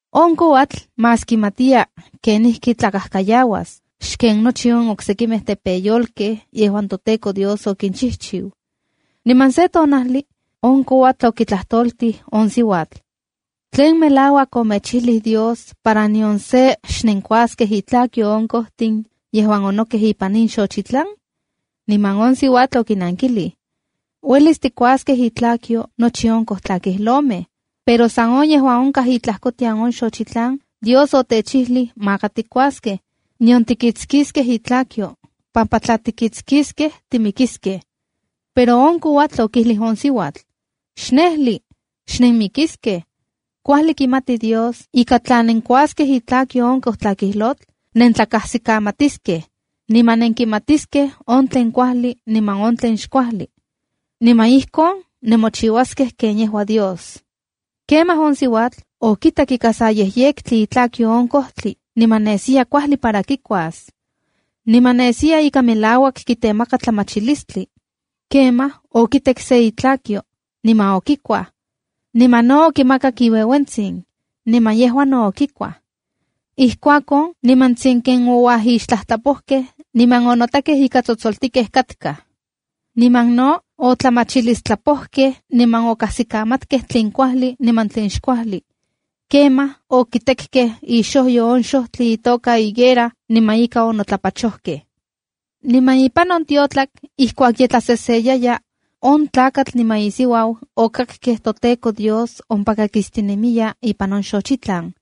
On kouatl más kimatiya kenijkitlakajkayauas xken nochi on oksekimej tepeyolkej yejuan toTEKO Dios okinchijchiu. Niman se tonajli on kouatl okitlajtoltij on siuatl: —¿Tlen melauak omechijlij Dios para nion se xnenkuaskej itlakyo on kojtin yejuan onokej ipan in xochitlan? Niman on siuatl okinankilij: —Uelis tikuaskej itlakyo nochi on kojtlakijlotl, pero san on yejuan onkaj itlajkotian on xochitlan, Dios otechijlij maka tikuaskej, nion tikitskiskej itlakyo, pampa tla tikitskiskej timikiskej. Pero on kouatl okijlij on siuatl: —Xnejli. Xnenmikiskej. Kuajli kimati Dios ika tla nenkikuaskej itlakyo on kojtlakijlotl nentlakajsikamatiskej, niman nenkimatiskej on tlen kuajli niman on tlen xkuajli. Niman ijkon nemochiuaskej ken yejua Dios. Kemaj on siuatl okitak ika sa yejyektli itlakyo on kojtli niman nesiya kuajli para kikuas. Niman nesiya ika melauak kitemaka tlamachilistli. Kemaj okitek se itlakyo niman okikuaj. Niman no okimakak iueuentsin, niman yejua no okikuaj. Ijkuakon nimantsin ken ouajixtlajtlapojkej niman onotakej ika tsotsoltikej katkaj. Niman no otlamachilistlapojkej niman okajsikamatkej tlen kuajli niman tlen xkuajli. Kemaj okitekkej ixojyo on kojtli itoka higuera niman ika onotlapachokej. Niman ipan on tiotlak ijkuak ye tlaseseyaya, on tlakatl niman isiuau okakkej toTEKO Dios ompaka kistinemiya ipan on xochitlan.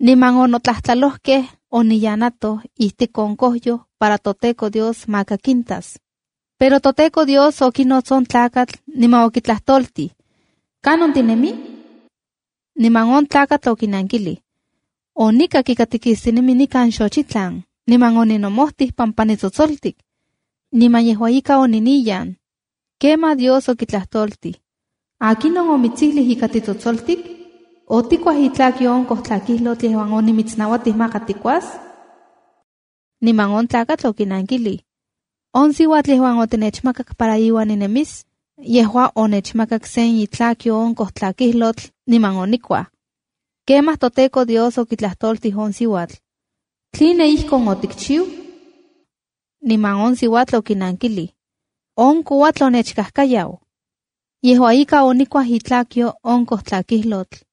Niman onotlajtlalojkej oniyanatoj ijtik on kojyoj para toTEKO Dios maka kintas. Pero toTEKO Dios okinots on tlakatl niman okitlajtoltij: —¿Kanon tinemi? Niman on tlakatl okinankilij —Onikak ika tikistinemi nikan xochitlan, niman oninomojtij pampa nitsotsoltik. Niman yejua ika oniniyan. Kemaj Dios okitlajtoltij: —¿Akinon omitsijlij ika titsotsoltik? ¿Otikuaj itlakyo on kojtlakijlotl yejuan onimitsnauatij maka tikuas? Niman on tlakatl okinankilij: —On siuatl yejuan otinechmakak para iuan ninemis, yejua onechmakak sen itlakyo on kojkakijlotl niman onikuaj. Kemaj toTEKO Dios okitlajtoltij on siuatl: —¿Tline ijkon otikchiu? Niman on siuatl okinankilij: —On kouatl onechkajkayau. Yejua ika, onikuaj itlakyo on kojkakijlotl.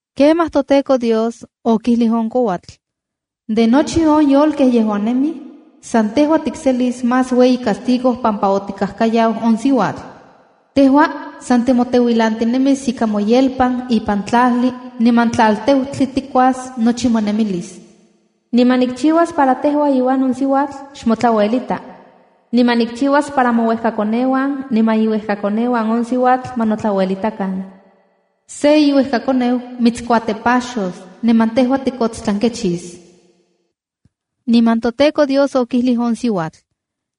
Kemaj toTEKO Dios okijlij on kouatl: —De nochi on yolkej yejuan nemij, san tejua tikselis más ueyi castigo pampa otikajkayau on siuatl. Tejua san timoteuilantinemis ika moyelpan ipan tlajli niman tlalteutli tikuas nochi monemilis. Niman nikchiuas para tejua iuan on siuatl xmotlauelita. Niman nikchiuas para mouejkakoneuan niman iuejkakoneuan on siuatl ma notlauelitakan. Se iuejkakoneu mitskuatepaxos niman tejua tikotstlankechis. Niman toTEKO Dios okijlij on siuatl: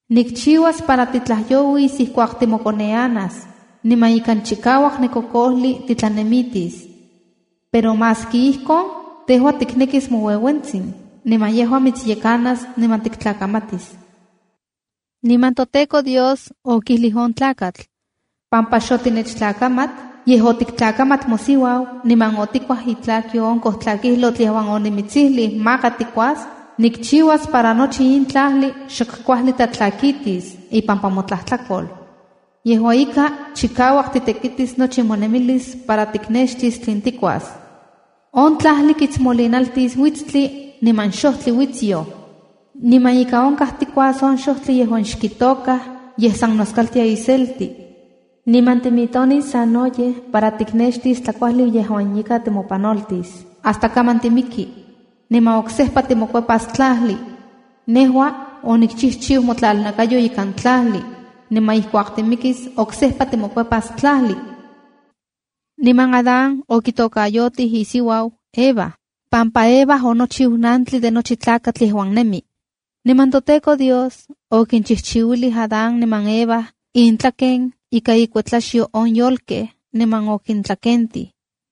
—Nikchiuas para titlajyouis ijkuak timokoneanas, niman ikan chikauak nekokojli titlanemitis. Pero maski ijkon, tejua tiknekis moueuentsin, niman yejua mitsyekanas niman tiktlakamatis. Niman toTEKO Dios okijlij on tlakatl: —Pampa xotinechtlakamat, yej otiktlakamat mosiuau niman otikuaj itlakyo on tlakojkakijlotl yejuan onimitsijlij maka tikuas, nikchiuas para nochi in tlajli xok kuajli tlatlakitis ipampa motlajtlakol. Yejua ika, chikauak titekitis nochi monemilis para tiknextis tlen tikuas. On tlajli kitsmolinaltis uitstli niman xojtli uitsyo. Niman ika onkaj tikuas on xojtli yejuan xkitokaj yej san noskaltia iselti. Niman timitonis sanoyej para tiknextis tlakuajli yejuan ika timopanoltis, hasta kaman timiki, niman oksejpa timokuepas tlajli. Nejua onikchijchiu motlalnakayo ikan tlajli, niman ijkuak timikis oksejpa timokuepas tlajli. Niman Adán okitokayotij isiuau Eva pampa Eva onochiu nantli de nochi tlakatl yejuan nemi. Niman toTEKO Dios okinchijchiuilij Adán niman Eva intlaken ika inkuetlaxyo on yolkej, niman okintlakentij.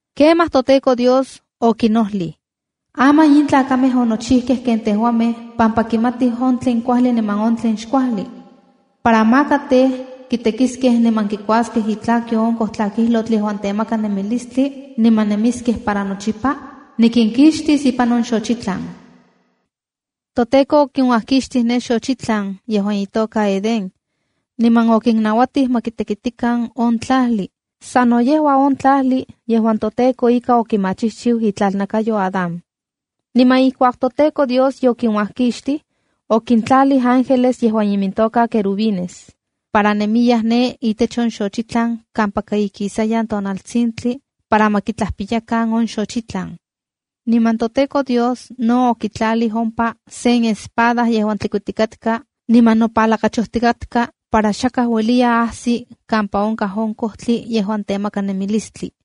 Kemaj toTEKO Dios okinojlij: “Aman in tlakamej onochijkej ken tejuamej pampa kimatij on tlen kuajli niman tlen xkuajli. Para maka tej, kitekiskej niman kikuaskej itlakyo on kojkakijlotl yejuan temaka nemilistli niman nemiskej para nochipa, nikinkixtis ipan on xochitlan.” ToTEKO okinuajkixtij ne xochitlan yejuan itoka Edén. Niman okinnauatij ma kitekitikan on tlajli, sano yejua on tlajli yejuan toTEKO ika okimachijchiu itlalnakayo Adán. Niman ijkuak toTEKO Dios yokinuajkixtij, okintlalij ángeles, yejuan imintoka querubines, para nemiyaj ne itech on xochitlan kampaka ikisayan tonaltsintli para ma kitlajpiyakan on xochitlan. Niman toTEKO Dios no okitlalij ompa sen espada yejuan tlikuitikatka niman nopalakachojtikatka para xakaj ueliya ajsi kampa onkaj on kojtli yejuan temaka nemilistli.